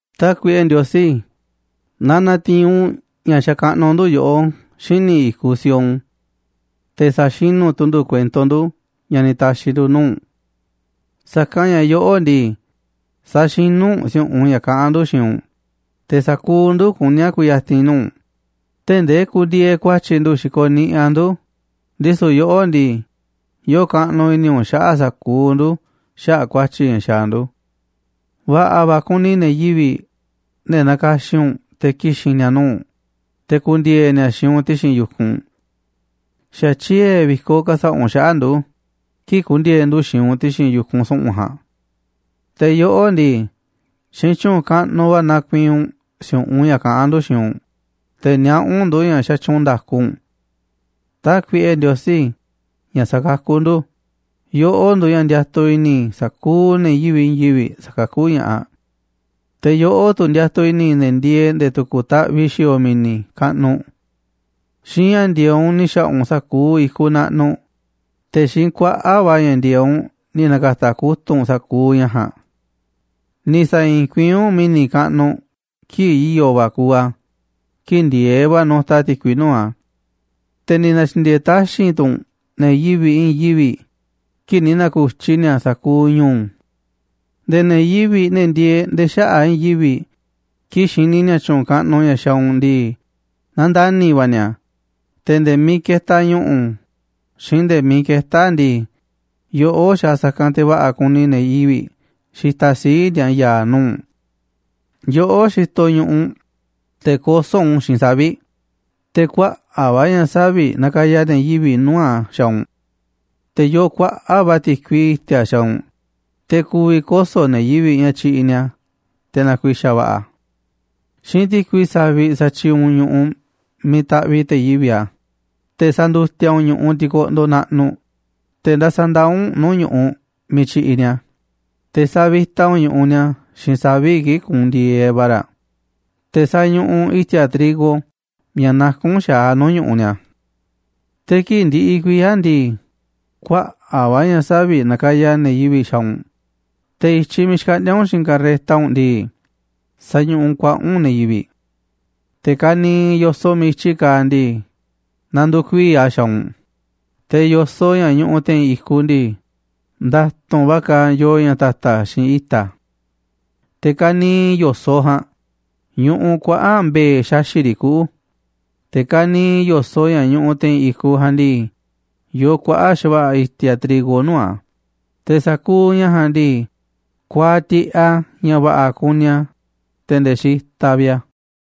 Tákuiꞌe Ndiosí, na na̱ti̱i̱n u̱nꞌ ña̱ xakaꞌnuꞌ ndu̱ yoꞌó xíniꞌ i̱kuꞌ Sión. Te̱ sa̱xinú tu̱ ndu̱ kuento ndu̱ ña̱ ni̱ ta̱xi̱ ndu̱ nuu̱ꞌ u̱nꞌ. Sa̱kanꞌ ña̱ yoꞌó ndii, saxinú u̱nꞌ si̱u̱ꞌunꞌ ña̱ kaꞌán ndu̱ xiinꞌ u̱nꞌ, te̱ sa̱kuuꞌ ndu̱ kuní a̱ ku̱ya̱ti̱n nuu̱ꞌ u̱nꞌ, tee̱ꞌ ndee kundieeꞌ ku̱a̱tyi̱ ndu̱ xikoꞌ niꞌiꞌ a̱ ndu̱, ndisu̱ yoꞌó ndii, yoo kaꞌnuꞌ i̱ni̱ u̱nꞌ xaꞌa̱ꞌ sa̱kuuꞌ ndu̱ xaꞌa̱ꞌ ku̱a̱tyi̱ ña̱ xaaꞌ ndu̱. Va̱ꞌa̱ va̱ kuni ne̱ yivi̱ꞌ, ne̱ nakaxin u̱nꞌ te̱ ki̱xi̱n ni̱a̱ nuu̱ꞌ u̱nꞌ, te̱ ku̱ndi̱e̱e̱ ni̱a̱ xiinꞌ u̱nꞌ ti̱xi̱n yu̱kunꞌ. Xa̱ tyiee̱ vi̱koꞌ ka̱sa̱ꞌa̱ u̱nꞌ xaꞌa̱ꞌ ndu̱ kii̱ꞌ ku̱ndi̱e̱e̱ ndu̱ xiinꞌ u̱nꞌ ti̱xi̱n yu̱kunꞌ su̱ꞌu̱n ja̱a̱nꞌ. Te̱ yoꞌó ndii, xiinꞌ tyu̱u̱n kaꞌnuꞌ va̱ nakuiinꞌ u̱nꞌ si̱u̱ꞌunꞌ ña̱ kaꞌán ndu̱ xiinꞌ u̱nꞌ, te̱ niaꞌá u̱nꞌ ndu̱ ña̱ xatyuunꞌ nda̱ku u̱nꞌ. Tákuiꞌe Ndiosí, ña̱ sakakú ndu̱, yoꞌó nduuꞌ ña̱ ndiatuꞌ i̱ni̱ sa̱kuuꞌ ne̱ yivi̱ꞌ i̱i̱n yivi̱ꞌ sa̱kakú ña̱ꞌaꞌ. Te̱ yoꞌó tu̱ ndiatuꞌ i̱ni̱ ne̱ ndieeꞌ nde̱e̱ tu̱ku̱ taꞌviꞌ xi̱o̱o̱ mi̱ni̱ kaꞌnuꞌ. Xiinꞌ ña̱ ndi̱e̱eꞌ u̱nꞌ ni̱ xa̱ꞌa̱ u̱nꞌ sa̱kuuꞌ i̱kuꞌ naꞌnuꞌ, te̱ xiinꞌ kuaꞌa̱ꞌ va̱ ña̱ ndi̱e̱eꞌ u̱nꞌ ni̱ na̱ka̱ta̱ kutu̱ꞌ u̱nꞌ sa̱kuuꞌ ña̱ ja̱a̱nꞌ. Ni̱ sa̱i̱i̱n kuiín u̱nꞌ mi̱ni̱ kaꞌnuꞌ kii̱ꞌ i̱yo̱ va̱ kuuꞌ a̱, kii̱ꞌ ndi̱e̱eꞌ va̱ nutaꞌ ti̱kui nuu̱ꞌ a̱. Te̱ ni̱ na̱tyi̱ndi̱e̱e̱ taxi̱nꞌ tu̱ u̱nꞌ ne̱ yivi̱ꞌ i̱i̱n yivi̱ꞌ kii̱ꞌ ni̱ na̱ku̱tyi ni̱a̱ sa̱kuuꞌ ñu̱u̱. Nde̱e̱ ne̱ yivi̱ꞌ, ne̱ ndieeꞌ nde̱e̱ xaꞌa̱ꞌ i̱i̱n yivi̱ꞌ kii̱ꞌ xini ni̱a̱ tyu̱u̱n kaꞌnuꞌ ña̱ xaaꞌ u̱nꞌ ndii, nandani̱ va̱ ni̱a̱, te̱ nde̱e̱ miiꞌ ketaꞌ ñu̱ꞌu̱ xiinꞌ nde̱e̱ miiꞌ ketá a̱ ndii, yoꞌó xaaꞌ sa̱kanꞌ te̱ va̱ꞌa̱ kuni ne̱ yivi̱ꞌ xitaꞌ sii̱ꞌ ni̱a̱ ya̱a̱ nuu̱ꞌ u̱nꞌ. Yoꞌó xitoꞌ ñu̱ꞌuꞌ, te̱ kosó u̱nꞌ u̱n xiinꞌ savi̱ꞌ, te̱ kuaꞌa̱ꞌ va̱ ña̱ savi̱ꞌ nakaya ne̱ yivi̱ꞌ nuu̱ꞌ a̱ xaaꞌ u̱nꞌ. Te̱ yoo kuaꞌa̱ꞌ va̱ ti̱kui i̱ti̱a̱ xaaꞌ u̱nꞌ, te̱ ku̱vi̱ koso̱ ne̱ yivi̱ꞌ ña̱ tyiꞌiꞌ ni̱a̱ te̱ na̱ku̱i̱xa̱ va̱ꞌa̱ a̱. Xiinꞌ ti̱kui saviꞌ satyiiꞌ u̱nꞌ ñu̱ꞌuꞌ miiꞌ taꞌviꞌ te̱ yivi̱ a̱, te̱ sandutiaꞌ u̱nꞌ ñu̱ꞌuꞌ tikoꞌndoꞌ naꞌnuꞌ, te̱ nda̱sa̱ ndaa̱ u̱nꞌ nuu̱ꞌ ñu̱ꞌuꞌ miiꞌ tyiꞌiꞌ ni̱a̱. Te̱ savita u̱nꞌ ñu̱ꞌuꞌ ni̱a̱ xiinꞌ savi̱ꞌ kii̱ꞌ kuunꞌ ndi̱e̱eꞌ va̱ raꞌ, te̱ sañuꞌuꞌ u̱nꞌ i̱ti̱a̱ trigo ña̱ nakún xa̱aꞌ nuu̱ꞌ ñu̱ꞌuꞌ ni̱a̱. Te̱ kii̱ꞌ ndiꞌiꞌ kuiya̱ ndii, kuaꞌa̱ꞌ va̱ ña̱ saviꞌ nakaya ne̱ yivi̱ꞌ xaaꞌ u̱nꞌ, te̱ i̱tyiꞌ miiꞌ xkaꞌndíá u̱nꞌ xiinꞌ karreta u̱nꞌ ndii, sañuꞌuꞌ kuaꞌa̱ꞌ u̱nꞌ ne̱ yivi̱ꞌ. Te̱ ka̱niiꞌ yo̱soꞌ miiꞌ i̱tyi kaaꞌ ndii, nanduuꞌ kuii̱ꞌ a̱ xaaꞌ u̱nꞌ, te̱ yo̱soꞌ ña̱ ñuꞌuꞌ te̱i̱n i̱kuꞌ ndii, nda̱tu̱nꞌ va̱ kaaꞌ yoo ña̱ ta̱ta̱ xiinꞌ i̱ta̱. Te̱ ka̱niiꞌ yo̱soꞌ ja̱a̱nꞌ ñuꞌuꞌ kuaꞌa̱ꞌ mbe̱e̱ xaxi̱ꞌ riꞌ kuꞌu̱, te̱ ka̱niiꞌ yo̱soꞌ ña̱ ñuꞌuꞌ te̱i̱n i̱kuꞌ ja̱a̱nꞌ ndii, yoo kuaꞌa̱ꞌ xa̱va̱ꞌa̱ i̱ti̱a̱ trigo nuu̱ꞌ a̱, te̱ sa̱kuuꞌ ña̱ ja̱a̱nꞌ ndii, kuaaꞌ tiꞌeꞌ a̱ ña̱ va̱ꞌa̱ kuni a̱, te̱ nde̱e̱ xitaꞌ vi̱ꞌ a̱.